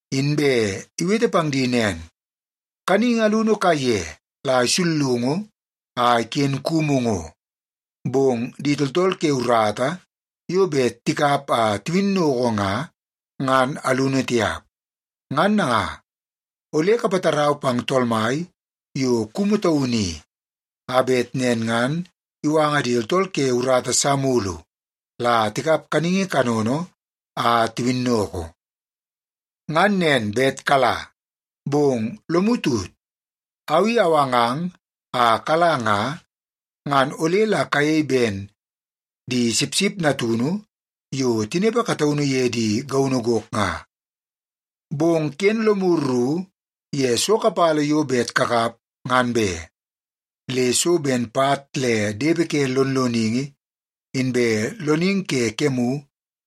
Inbe iwete pang di nen, “Kaningi alunu kaiye la isullungu a iken kumu ngo, bong di tooltool ke urata yo bet tikap a tiwinnoko nga, ngan alunu tiap. Ngan nanga, ole kapatarau pang Tool Mai yo kumu taunu i, a bet nen ngan iwanga di tooltool ke urata sa mulu la tikap kaningi kanono a tiwinnoko. Ngan nen bet kala! Bong lomu tut, au i awangang a kala nga, ngan ole la kayei ben di sipsip natunu yo tinepe kataunu ye di gaunu gok nga. Bong ken lomu ru ye so kapala yo bet kakap ngan be. Le so ben pat le depe ke lonloningi, inbe loningi ke kemu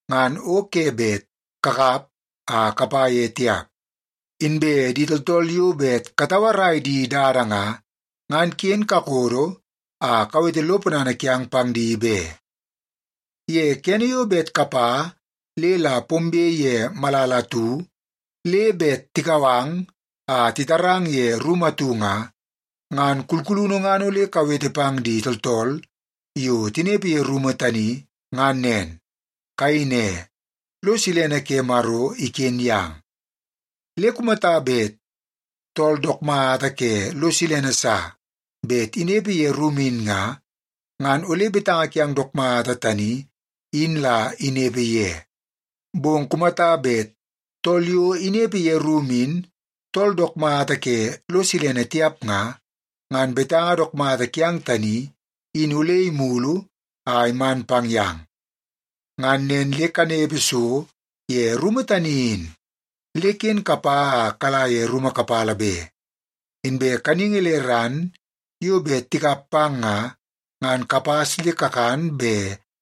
ngan o ke bet kakap a kapa ye tiap. Inbe di tooltool yo bet katauarai di dada nga, ngan ken kakodo a kawete lo ponana kiang pang di be. “Ye kene yo bet kapa le la pombe ye malala atu, le bet tikau ang a titarang ye rumu atu nga, ngan kulkulunu ngan ole kawete pang di tooltool yo tinepe ye rumu tani, ngan nen. Kayei ne, ‘Lo silene ke Maro iken yang.’ Le kumata bet tool dook mata ke lo silene sa bet inepe ye rumu in nga, ngan ole betanga kiang dook mata tani in la inepe ye. Bong kumata bet tool yo inepe ye rumu in tool dook mata ke lo silene tiap nga, ngan betanga dook mata kiang tani, in ole imulu a iman pang yang. Ngan nen le kanepe so ye rumu tani in, le ken kapa a kala ye rumu kapala be. Inbe kaningi le ran yo bet tikap pang nga ngan kapas le kakan be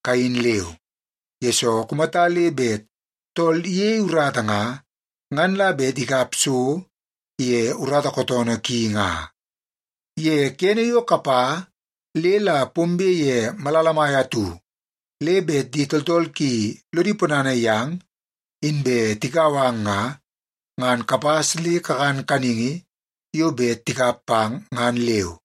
kayin leu, yesoo kumata le bet tool iyei urata nga, ngan la bet ikap so ye urata kootoonoo ki nga. “Ye kene yo kapa le la pombe ye malala mai atu le bet di tooltool ki lodi ponana yang, inbe tikau ang nga, ngan kapas le kakan kaningi yo bet tikap pang ngan leu.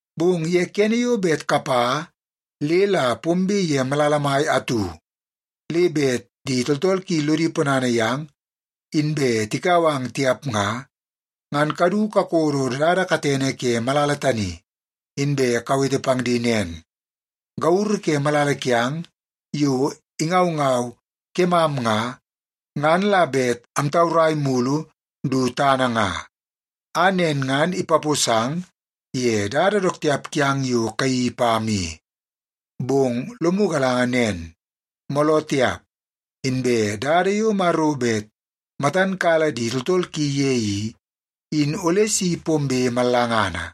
Bong ye kene yo bet kapa le la pombe ye malala mai atu, le bet di tooltool ki lodi ponana yang inbe tikau ang tiap nga, ngan kadu kakodo dada katene ke malala tani, inbe kawete pang di nen, ‘Gauru ke malala kiang yo ingaungau kemam nga, ngan la bet amtaurai mulu du tana nga, a nen ngan ipaposang ye dada dook tiap kiang yo kayeii pam i. Bong lomu galanga nen; mooloo tiap, inbe dada yo Maro bet matan kala di tooltool ki ye i, in ole si pombe mallangana.’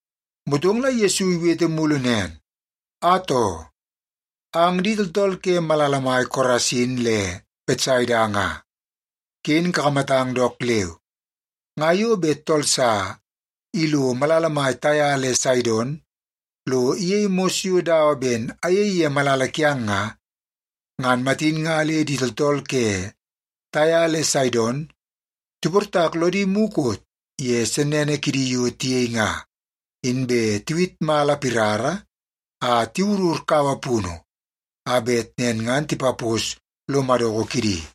Motong la Yesu iwete mulu nen, “Atoo! Ang di tooltool ke malala mai Korasin le Betsaida nga, ken kakamatang dook leu. Nga yo bet tool sa ilo malala mai Taia le Saidon lo iyei mos yo dawa ben ayei ye malala kiang nga, ngan matin nga le di tooltool ke Taia le Saidon tiportak lodi mukot ye sennene kidi yo tiyei nga, inbe tiwit mala pirara a tiwurur kaua punu a bet nen ngan tipapos lo madoko kidi.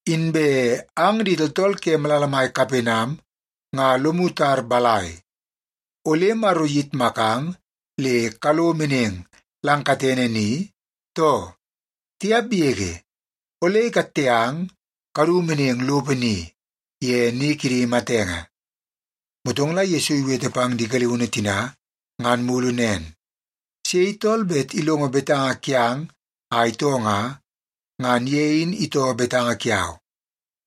Inbe ang di tooltool ke malala mai Kapenam nga lomu tar balai, ole Maro iyitmakang le kalo meneng lang katene ni, too? Tiap yege! Ole ikatte ang kadu meneng lopo ni, ye ni kidi matenge.” Motong la Yesu iwete pang di galiunu tina ngan mulu nen, “Sei tool bet ilongo betanga kiang a itoo nga, ngan ye in itoo betanga kiau.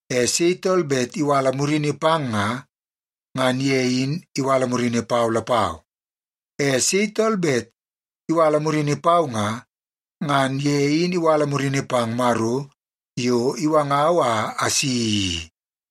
E sei tool bet iwala murini pang nga, ngan ye in iwala murini pau lapau. E sei tool bet iwala murini pau nga, ngan ye in iwala murini pang Maro yo iwangau a asi i.”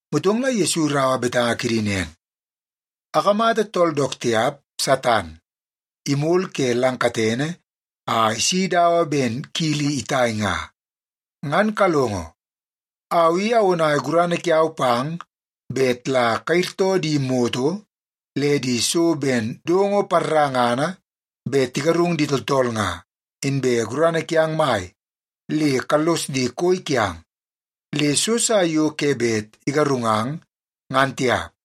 Motong la Yesu iraua betanga kidi nen, “Akamata tool dook tiap, Satan, imol ke lang katene a isi dawa ben kili itai nga. Ngan kalongo. Au i awonai gurana kiau pang bet la kayirtoo di moto le di so ben dongo parangana bet tigarung di tooltool nga, inbe gurana kiang mai le kallos di koi kiang, le so sa yo ke bet igarungang, ngan tiap.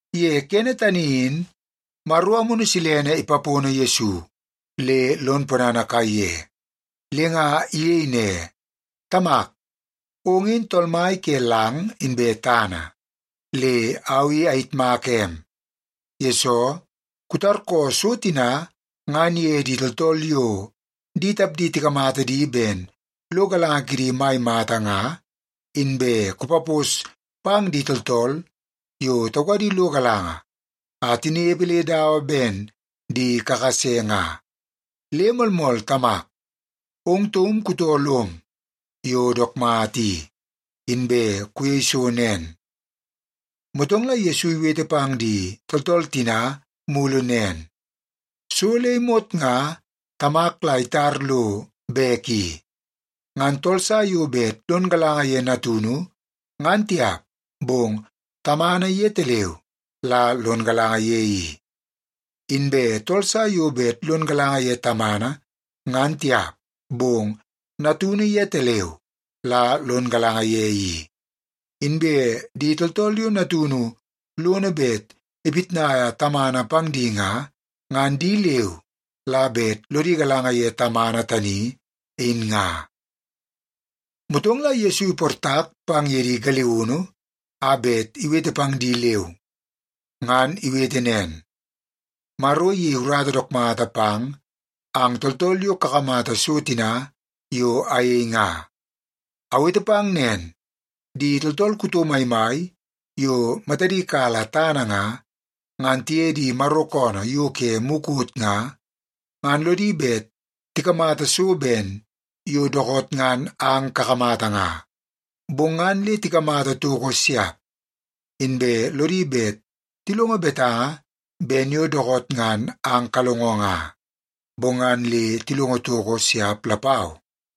Ye kene tani in, Maro Amunu Silene ipapono Yesu le lon ponana kaiye, le nga iyei ne, “Tamak, ong in Tool Mai ke lang inbe tana. Le au i ayitmaka em, yesoo kutarkoo so tina ngan ye di tooltool yo di tapdi tikamata di ben lo galanga kidi mai mata nga, inbe kupapos pang di tooltool yo taukadi lo galanga a tinepe le dawa ben di kakase nga. Le moolmool Tamak, ong taum kutoo lom yo dook mata i, inbe kuyei so nen.” Motong la Yesu iwete pang di tooltool tina mulu nen, “So le imot nga Tamak la itar lo bek i. Ngan tool sa yo bet lon galanga ye Natunu, ngan tiap, bong Tamana yetaleu la lon galanga ye i. Inbe tool sa yo bet lon galanga ye Tamana, ngan tiap, bong Natunu yetaleu la lon galanga ye i. Inbe di tooltool yo Natunu lono bet ipitnaia Tamana pang di nga, ngan di leu la bet lodi galanga ye Tamana tani in nga.” Motong la Yesu iportak pang ye di galiunu a bet iwete pang di leu, ngan iwete nen, “Maro iyei urata dook mata pang ang tooltool yo kakamata so tina yo ayei nga. Awete pang nen, di tooltool kuto maimai yo matadi kala tana nga, ngan tiye di Maro koonoo yo ke mukot nga, ngan lodi bet tikamata so ben yo dookoot ngan ang kakamata nga, bong ngan le tikamata toko siap. Inbe lodi bet tilongo betanga ben yo dookoot ngan ang kalongo nga, bong ngan le tilongo toko siap lapau.”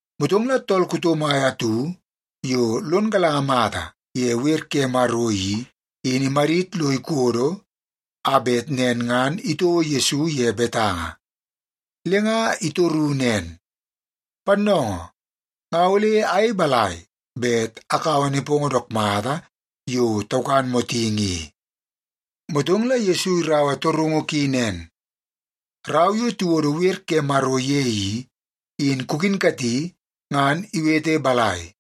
Motong la tool kuto mai atu yo lon galanga mata ye wer ke Maro i, in imadit lo ikodo a bet nen ngan itouo Yesu ye betanga. Le nga itoru nen, “Pannoongoo, nga ole ayei balai bet akaua nepongo dook mata yo taukan motingi i?” Motong la Yesu iraua torungu ki nen, “Rau yo tiwodo wer ke Maro ye i, in kukinkati ngan iwete balai?”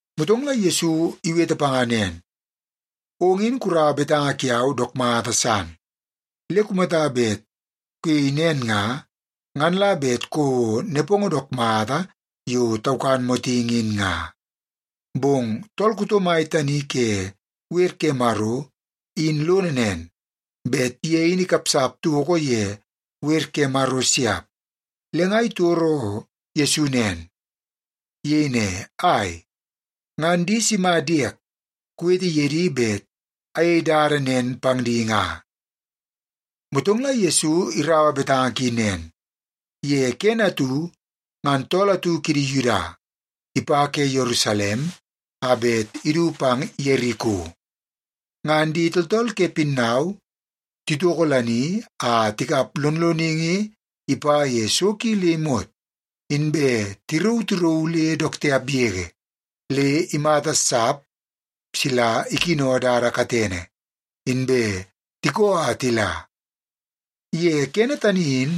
Motong la Yesu iwete panga nen, “Ong in kuraua betanga kiau dook mata san. Le kumata bet kuyei nen nga, ngan la bet kouo nepongo dook mata yo takan motingi in nga.” Bong tool kuto mai tani ke wer ke Maro in lono nen, bet ye in ikapsap toko ye wer ke Maro siap, le nga itoro Yesu nen. Iyei ne, “Ai, ngan di sima diek kuwete ye di bet ayei dada nen pang di nga?” Motong la Yesu iraua betanga ki nen, “Ye kene atu ngan tool atu kidi Yuda ipa ke Yerusalem a bet idu pang Yeriko. Ngan di tooltool ke pinnau titokolani a tikap lonloningi ipa ye so ki le imot, inbe tirauu tirauu le dook tiap yege, le imata sap sila ikino dada katene, inbe tikoo a tila. Ye kene tani in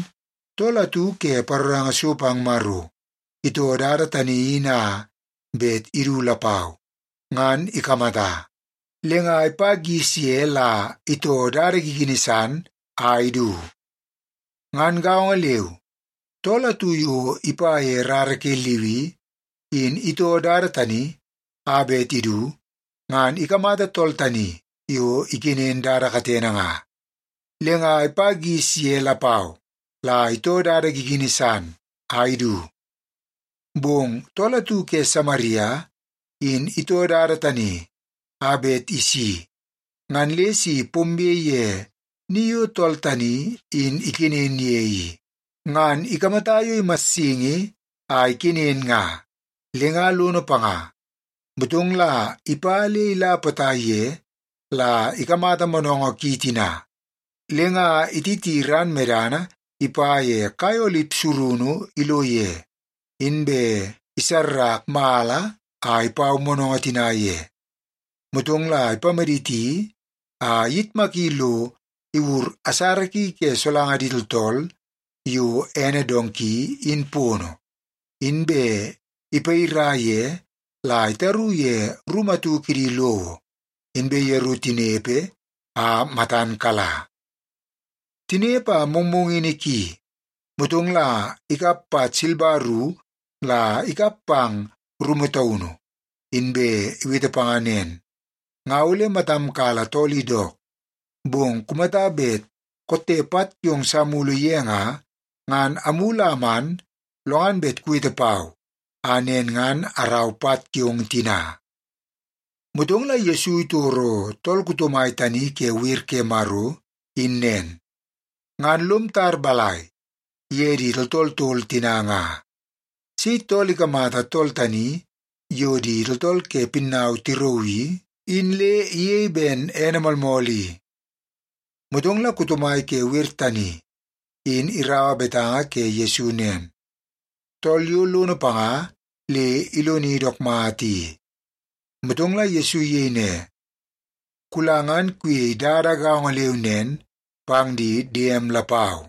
tool atu ke paroranga so pang Maro itoo dada tani in a bet idu lapau, ngan ikamata. Le nga ipa gis ye la itoo dada gigini san a idu. Ngan gaongo leu, tool atu yo ipa ye rara ke Liwi in itoo dada tani a bet idu ngan ikamata tool tani yo ikenen dada katene nga, le nga ipa gis ye lapau la itoo dada gigini san a idu. Bong tool atu ke Samaria in itoo dada tani a bet isi ngan le si pombe ye ni yo tool tani in ikenen ye i, ngan ikamata yo imassingi a ikenen nga, le nga lono panga. Motong la ipa le ila potai ye la ikamata moonoongoo ki tina, le nga ititi ran medana ipa ye kai olip surunu ilo ye, inbe isarrak mala a ipau moonoongoo tina ye. Motong la ipamaditi a iyitmaki lo iwur asara ki ke solanga di tooltool yo ene donki in pono, inbe ipayira ye la itaru ye rumu atu kidi lowo, inbe yeru tinepe a matan kala. Tinepe a mongmongini ki, motong la ikap pat silba ru la ikap pang rumu taunu, inbe iwete panga nen, ‘Nga ole matam kala tool i dook, bong kumata bet kotte pat kiong sa mulu ye nga, ngan amulu a aman lo ngan bet kuwete pau a nen ngan arau pat kiong tina.’” Motong Yesu titoro tool kuto mai tani ke wer ke Maro in nen, “Ngan lom tar balai ye di tooltool tol tina nga? Sei tool ikamata tool tani yo di tooltool ke pinnau tirauu i, in le iyei ben ene moolmool i?” Motong la kuto mai ke wer tani in iraua betanga ke Yesu nen, “Tool yo lono panga le iloni dook mata i.” Motong la Yesu iyei ne, “Kula ngan kuyei dada gaongo leu nen pang di diem lapau.”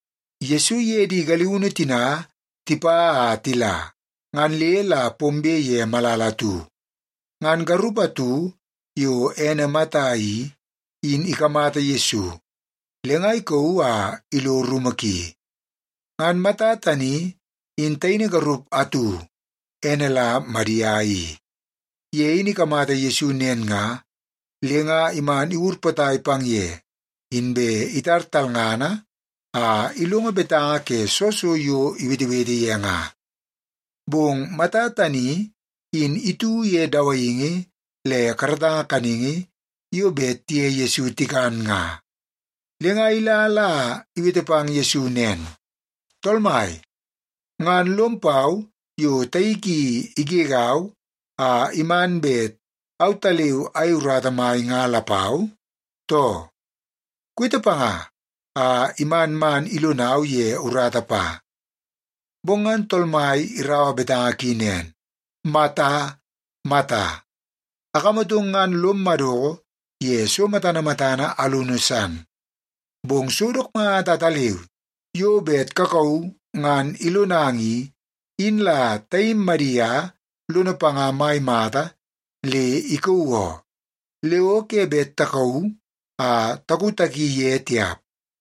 Yesu iye di galiunu tina tipa a tila, ngan le la pombe ye malala atu. Ngan garup atu yo ene Mata i, in ikamata Yesu, le nga ikauu a ilo rumu ki. Ngan Mata tani in taini garup atu, ene la Madia i. Ye in ikamata Yesu nen nga, le nga iman iwur potai pang ye, inbe itar talngana a ilongo betanga ke soo so yo iwetewete ye nga. Bong Mata tani in itu ye dawaingi le karatanga kaningi yo bet tiye Yesu tikan nga, le nga ila la iwete pang Yesu nen, “Tool Mai, ngan lom pau yo taik i igegau a iman bet autaleu ayei urata mai nga lapau, too? Kuwete panga a iman man ilonau ye urata pa.” Bong ngan Tool Mai iraua betanga ki nen, “Mata, Mata, akamatong ngan lom madoko ye so matana matana alunu san. Bong so dook mata ataleu yo bet kakauu ngan ilonang i, in la taim Madia lono panga mai mata le ikauu oo. Le o ke bet takauu a takutaki ye tiap.”